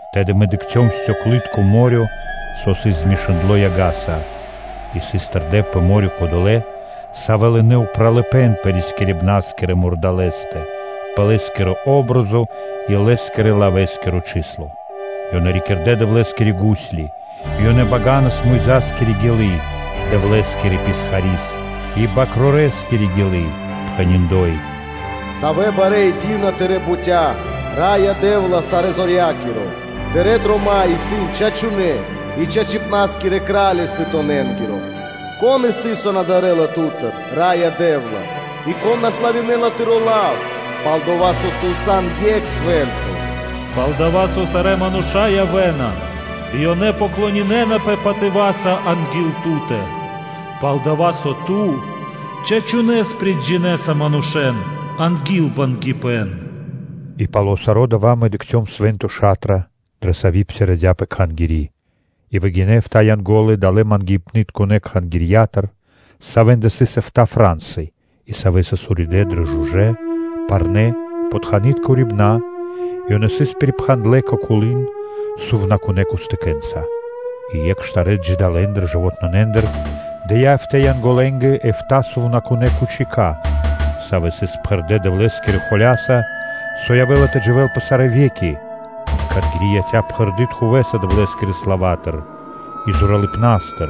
Тэды мэ дыкхцём вари-со сы́рбы стёклы́тко (балунало́) мо́рё (дэрья́в), саво́ сыс змешындло яга́са. И сыс тэрдэ́ пэ мо́рё (дэрья́в) кодолэ́, савэ́ лынэ́ упралыпэ́н пэ рискирибна́скирэ мурдалэ́стэ, пэ лэ́скири патри́н (о́бразо) и лэ́скирэ-лавэскиро чысло (гин). Ёнэ рикирдэ Дэвлэ́скирэ гусли. И ёнэ баганас Мойзаскири гилы́, Дэвлэ́скирэ писхарискири, и Свэнтонэ́ Бакрорэскири гилы́, пхэни́: “Савэ барэ́ и ди́вна тырэ́ бутя́, Раё Дэ́вла, Сарэзорья́киро! Тырэ́ дрома́ исын чачунэ́ и чачипнаскирэ, Кра́ли манушэ́нгиро! Кон исын одова́, саво на дарэ́ла Ту́тыр, Раё Дэ́вла, И кон на славинэла Тыро́ Лав? Пал-дова́ со Ту сан Екх Свэ́нто, пал-дова́ со сарэ́ мануша́ явэ́на, и ёнэ поклонинэнапэ патыва́са анги́л Ту́тэ пал-дова́, со Ту чачунэ́с приджинэса манушэ́н анги́л бангипэн!” И пало́ (после) саро́ дава́ мэ дыкхцём Свэ́нто Ша́тра, дрэ Сави́ псирадяпэ Кхангири́. И выгинэ́ эфта́ Янго́лы далэ́ Кхангирья́тыр, савэ́ндэ сыс эфта́ фра́нсы, и савэ́ сыс уридэ́ дрэ жужэ́, парнэ́, похтанытка урибэна́ и ёнэ сыс пирипхандлэ кэ колы́н сувнакунэ́ кустыкэнца. И екх штарэ́ джидалэндыр (жывотнонэндыр) дыя́ эфта́ Янголэнгэ эфта́ сувнакунэ́ кучика, со сыс пхэрдэ́ Дэвлэ́скирэ холя́са, со явэ́ла тэ дживэ́л пэ сарэ́ ве́ки. И Кхангири́ яця́ пхэрды́ тхувэса Дэвлэ́скирэ славатыр и зоралыпнастыр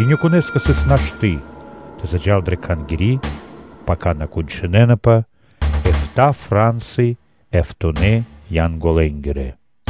и никонэ́скэ сыс нашты́ тэ заджа́л дрэ Кхангири́, пака кончынэнапэ эфта́ фра́нсы Янголэ́нгирэ.